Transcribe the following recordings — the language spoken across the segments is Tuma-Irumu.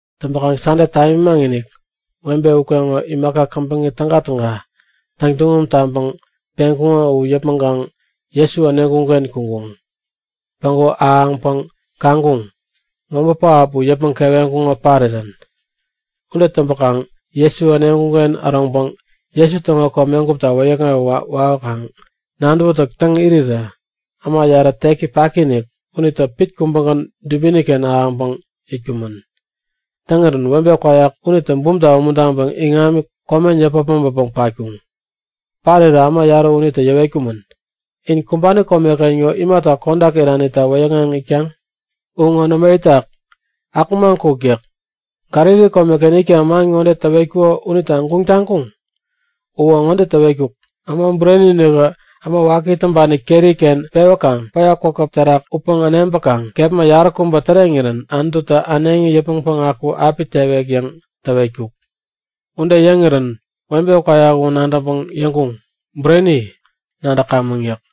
Täŋpäkaŋ Sande tamimaŋ-inik webe ukeŋo imaka käbäŋi tägatäga täŋtuŋum taŋpäŋ peŋkuŋo u yäpmäŋkaŋ Jesu äneŋkuŋ-ken kuŋkuŋ. Päŋku ahäŋpäŋ kaŋkuŋ; Mobä pähap u yäpmäŋ keweŋkuŋo parirän. Ude täŋpäkaŋ Jesu äneŋkuŋ-ken äroŋpäŋ Jesu täŋo komegupta wäyäkŋewä wawäkaŋ nadäwätäk täŋ irirä äma yarä teki paki-inik unitä pit kubägän dubini-ken ahäŋpäŋ itkumän. Täŋirän webe kwayak unitä bumta umuntaŋpäŋ iŋami komen yäpä äpmoŋpäpäŋ patkuŋ. Parirä äma yarä unitä yäwetkumän; In kumbani komeken ŋo imata kodak iranita wäyäkŋeŋ itkaŋ? U ŋo nämo itak, akumaŋ kuk yäk. Galili komeken itkaŋ man ŋode täwetkuko unita guŋ taŋkuŋ? Uwä ŋode täwetkuk; Äma Bureni-inikä, äma waki täŋpani keri-ken pewäkaŋ päya kwakäp terak utpäŋ äneŋpäkaŋ kepma yaräkubä täreŋirän Anututä äneŋi yäpmäŋ päŋaku api tewek yäŋ täwetkuk. Ude yäŋirän webe kwayak u nadäŋpäŋ yäŋkuŋ; Bureni, nadäkamäŋ! yäk.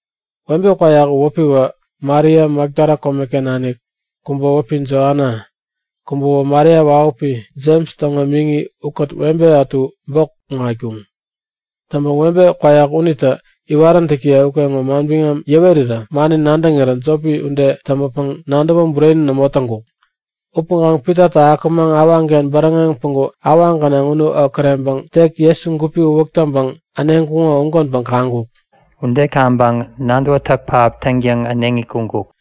Webe kwayak u wäpiwä Maria Makdala komeken nanik, kubä wäpi Joana, kubäwä Maria wahupi Jems täŋo miŋi ukät webe ätu bok kuŋatkuŋ. Täŋpäŋ webe kwayak unitä iwaräntäkiye ukeŋo manbiŋam yäwerirä mani nadäŋirä jopi ude täŋpäpäŋ nadäwä bureni nämo täŋkuk. Upäŋkaŋ Pitatä akumaŋ awaŋken bäräŋeŋ päŋku awaŋ gänaŋ umu okäreŋpäŋ tek Jesu gupi uwäk täŋpäŋ äneŋkuŋo ugänpäŋ kaŋkuk. Ude kaŋpäŋ nadäwätäk pähap täŋtäŋ äneŋi kuŋkuk.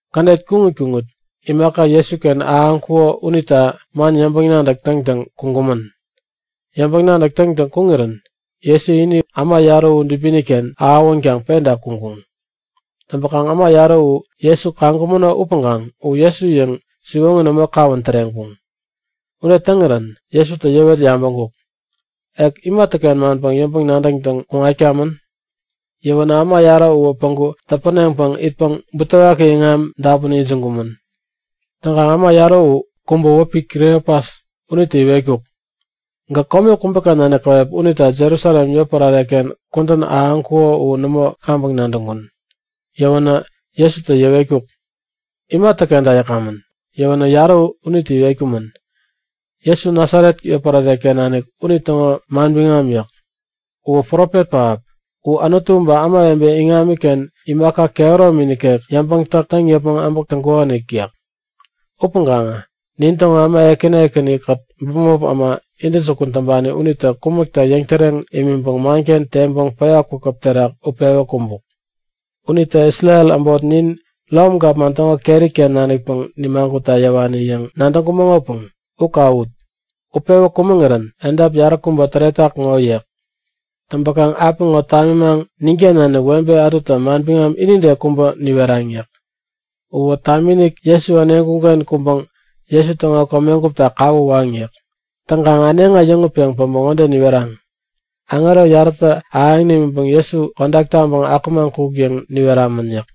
Kädet kuŋit kuŋit imaka Jesuken ahäŋkuko unita man yäŋpäŋ-nadäk täŋtäŋ kuŋkumän. Yäŋpäŋ-nadäk täŋtäŋ kuŋirän Jesu ini äma yarä u dubini-ken ahäwänkaŋ penta kuŋkuŋ. Täŋpäkaŋ äma yarä u Jesu kaŋkumäno upäŋkaŋ u Jesu yäŋ siwoŋi nämo kawän täreŋkuŋ. Ude täŋirän Jesutä yäwet yabäŋkuk; Ek imatäken manpäŋ yäŋpäŋ-nadäk täŋtäŋ kuŋatkamän? Yäwänä äma yarä uwä päŋku täpäneŋpäŋ itpäŋ butewaki iŋami dapun ijiŋkumän. Täŋkaŋ äma yarä u kubä wäpi Kliopas unitä iwetkuk; Gäk kome kubäken nanik käwep unita Jerusalem yotpärare-ken kudän ahäŋkuko u nämo kaŋpäŋ nadäŋkun. Yäwänä Jesutä yäwetkuk; Imatäkenta yäkamän? Yäwänä yarä unitä iwetkumän; Jesu Nasaret yotpärare-ken nanik unitäŋo manbiŋam yäk. U profet pähap. U Anutu ba ämawebe iŋamiken imaka kehäromi nikek yäŋpäŋ-täk täŋ yäpmäŋ äbäk täŋkukonik yäk. Upäŋkaŋä nintäŋo äma ekäni ekäni-kät bämop äma intäjukun täŋpani unitä kumäkta yäŋtäreŋ imiŋpäŋ manken teŋpäŋ päya kwakäp terak utpewä kumbuk. Unitä Isrel äbot nin Rom gapman täŋo keri-ken nanikpäŋ nimagutta yäwani yäŋ nadäŋkumäŋopäŋ u kawut, utpewä kumäŋirän edap yaräkubä täretak ŋo yäk. Täŋpäkaŋ apiŋo tamimaŋ ninken nanik webe ätutä manbiŋam inide kubä niweraŋ yäk. Uwä tamiinik Jesu äneŋkuŋ-ken kuŋpäŋ Jesu täŋo komegupta kawä waŋ yäk. Täŋkaŋ äneŋi äyäŋutpeŋ päbä ŋode niweraŋ; Aŋero yarätä ahäŋ nimiŋpäŋ Jesu kodak taŋpeŋ akumaŋ kuk yäŋ niweramän yäk.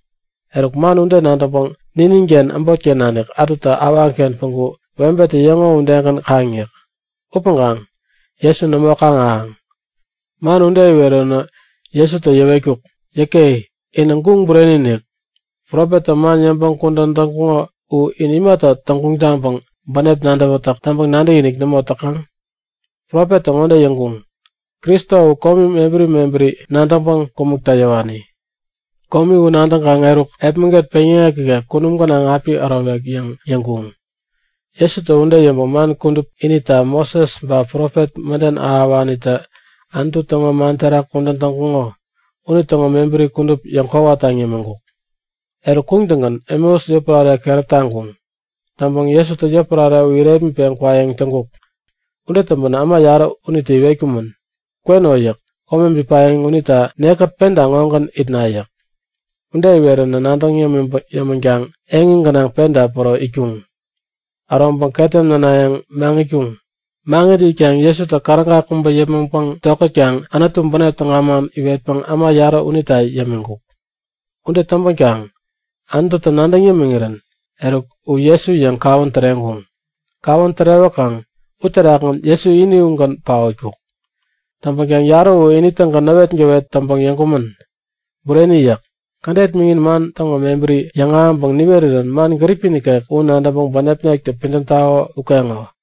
Eruk man u nadäŋpäŋ nininken äbotken nanik ätutä awaŋken päŋku webetä yäŋo udegän kaŋ yäk. Upäŋkaŋ Jesu nämo kaŋ-ahäŋ. Man ude iweränä Jesutä yäwetkuk; Yäke! Inä guŋ bureni-inik! Profettä man yäŋpäŋ kudän täŋkuŋo u in imata täŋguŋ taŋpäŋ bänep nadäwätäk täŋpäŋ nadäkinik nämo täkaŋ? Profettä ŋode yäŋkuŋ; Kristo u komi mebäri mebäri nadäŋpäŋ kumäkta yäwani. Komi u nadäŋkaŋ eruk, epmäget peŋyäŋek ikek kunum gänaŋ api ärowek yäŋ yäŋkuŋ. Jesutä ude yäŋpäŋ man kudup inita, Moses ba profet mäden ahäwanitä Anutu täŋo man terak kudän täŋkuŋo unitäŋo mebäri kudup yäŋkwawa taŋ yämiŋkuk. Eruk, kuŋtäŋgän Emeus yotpärare keräp taŋkuŋ. Täŋpäŋ Jesutä yotpärare u irepmitpeŋ kwayäŋ täŋkuk. Ude täŋpänä äma yarä unitä iwetkumän; Kweno yäk. Kome bipayäŋ unita nekkät penta ŋogän itna yäk. Ude iwerän nadäŋ yämänkaŋ eŋi gänaŋ penta päro itkuŋ. Äroŋpäŋ ketem nänayäŋ maŋitkuŋ. Maŋit itkaŋ Jesutä käräga kubä yäpmäŋpäŋ tokätkaŋ Anutu bänep täga man iwetpäŋ äma yarä unita yämiŋkuk. Ude täŋpänkaŋ Anututä nadäŋ yämiŋirän eruk U Jesu yäŋ kawän täreŋkuŋ. Kawän tärewäkaŋ uterakgän Jesu ini ugän paotkuk. Täŋpänkaŋ yarä u ini-tägän näwetgäwet täŋpäŋ yäŋkumän; Bureni! yäk. Kädet miŋin man täŋo mebäri yäŋahäŋpäŋ niwerirän man gäripi nikek u nadäŋpäŋ bänepnektä pidäm tako ukeŋo!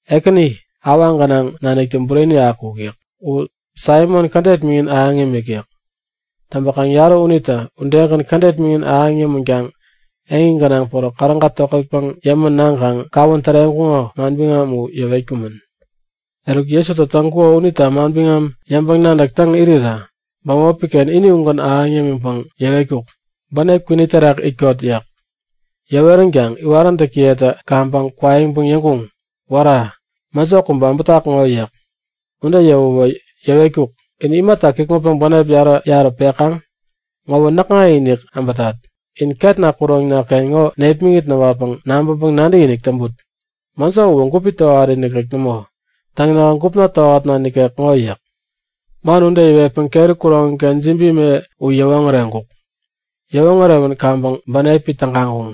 Ekäni awaŋ gänaŋ naniktä bureni akuk! yäk. U Saimon kädet miŋin ahäŋ imik yäk. Täŋpäkaŋ yarä unitä udegän kädet miŋin ahäŋ yämänkaŋ eŋi gänaŋ päro käräga tokätpäŋ yämän naŋkaŋ kawän täreŋkuŋo manbiŋam upäŋ yäwetkumän. Eruk Jesutä täŋkuko unita manbiŋam yäŋpäŋ-nadäk täŋ irirä bämopi-ken ini ugän ahäŋ yämiŋpäŋ yäwetkuk; Bänep kwini terak itkot! yäk. Yäweränkaŋ iwaräntäkiyetä kaŋpäŋ kwaiŋpäŋ yäŋkuŋ; Wära! Mäjo kubä äbätak ŋo! yäk. Ude yäwäwä yäwetkuk; In imata kikŋutpäŋ bänep yarä-yarä pekaŋ? Ŋowä näkŋa-inik äbätat. In ketna kuroŋna-ken ŋo nepmäŋit näwatpäŋ nabäŋpäŋ nadäkinik täŋput. Mäjo uwä gupi tohari nikek nämo. Täŋ, nähä gupna tohatna nikek ŋo yäk. Man ude yäwetpäŋ keri kuroŋi-ken jibi me u yäwoŋäreŋkuk. Yäwoŋärewän kaŋpäŋ bänepi tägaŋkuŋ.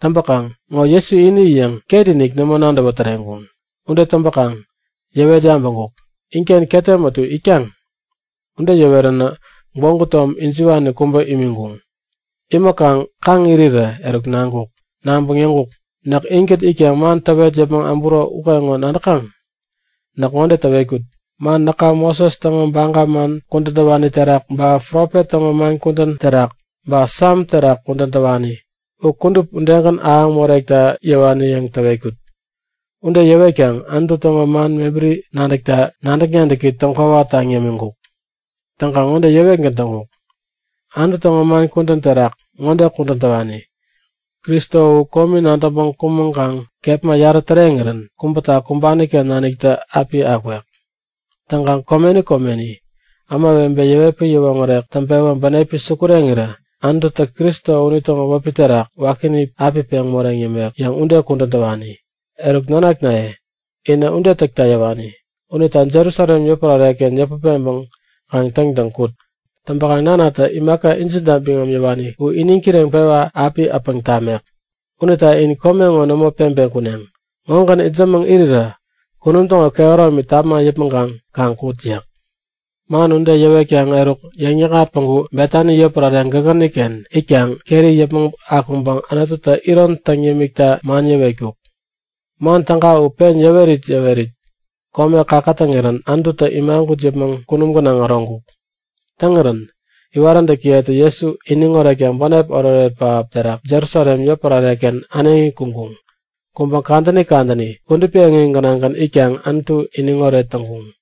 Täŋpäkaŋ ŋo Jesu ini yäŋ ketinik nämo nadäwä täreŋkuŋ. Ude täŋpäkaŋ yäwet yabäŋkuk; Inken ketem ätu itkaŋ? Ude yäweränä gwägu tom ijiwani kubä imiŋkuŋ. Imiŋkaŋ kaŋ irirä, eruk naŋkuk. Naŋpäŋ yäŋkuk; Näk inkät itkaŋ man täwet yäpmäŋ äburo ukeŋo nadäkaŋ? Näk ŋode täwetkut; Man näka Moses täŋo baga man kudän täwani terak, ba profet täŋo man kudän terak ba Sam terak kudän täwani u kudup udegän ahäŋ morekta yäwani yäŋ täwetkut. Ude yäwetkaŋ Anutu täŋo man mebäri nadäkta nadäk-nadäki täŋkwawa taŋ yämiŋkuk. Täŋkaŋ ŋode yäwetgän täŋkuk; Anutu täŋo man kudän terak ŋode kudän täwani; Kristo u komi nadäŋpäŋ kumäŋkaŋ kepma yarä täreŋirän kubäta kumbani-ken naniktä api akwek. Täŋkaŋ komeni komeni ämawebe yäwetpäŋ yäwoŋärek täŋpewä bänepi sukureŋirä Anututä Kristo unitäŋo wäpi terak wakini api peŋ moreŋ yämek yäŋ ude kudän täwani. Eruk nanaknaye, inä ude täkta yäwani. Unita Jerusalem yotpärare-ken yäput peŋpäŋ kaŋ täŋtäŋ kut. Täŋpäkaŋ nanatä imaka injinta biŋam yäwani u iniŋ kireŋpewa api äpäŋ tamek. Unita in kome ŋo nämo peŋpeŋ kuneŋ. Ŋogän itsämäŋ irirä kunum täŋo kehäromi tama yäpmäŋkaŋ kaŋ kut yäk. Man ude yäwetkaŋ eruk yäŋ-yäkŋat päŋku Betani yotpärare gägäniken itkaŋ keri yäpmäŋ akuŋpäŋ Anututä iron täŋ yämikta man yäwetkuk. Man täga u pen yäwerit yäwerit kome käkätäŋirän Anututä imagut yäpmäŋ kunum gänaŋ äroŋkuk. Täŋirän iwaräntäkiyetä Jesu iniŋ oretkaŋ bänep oretoret pähap terak Jerusalem yotpärare-ken äneŋi kuŋkuŋ. Kuŋpäŋ kadäni kadäni kudupi eŋi gänaŋgän itkaŋ Anutu iniŋ oret täŋkuŋ.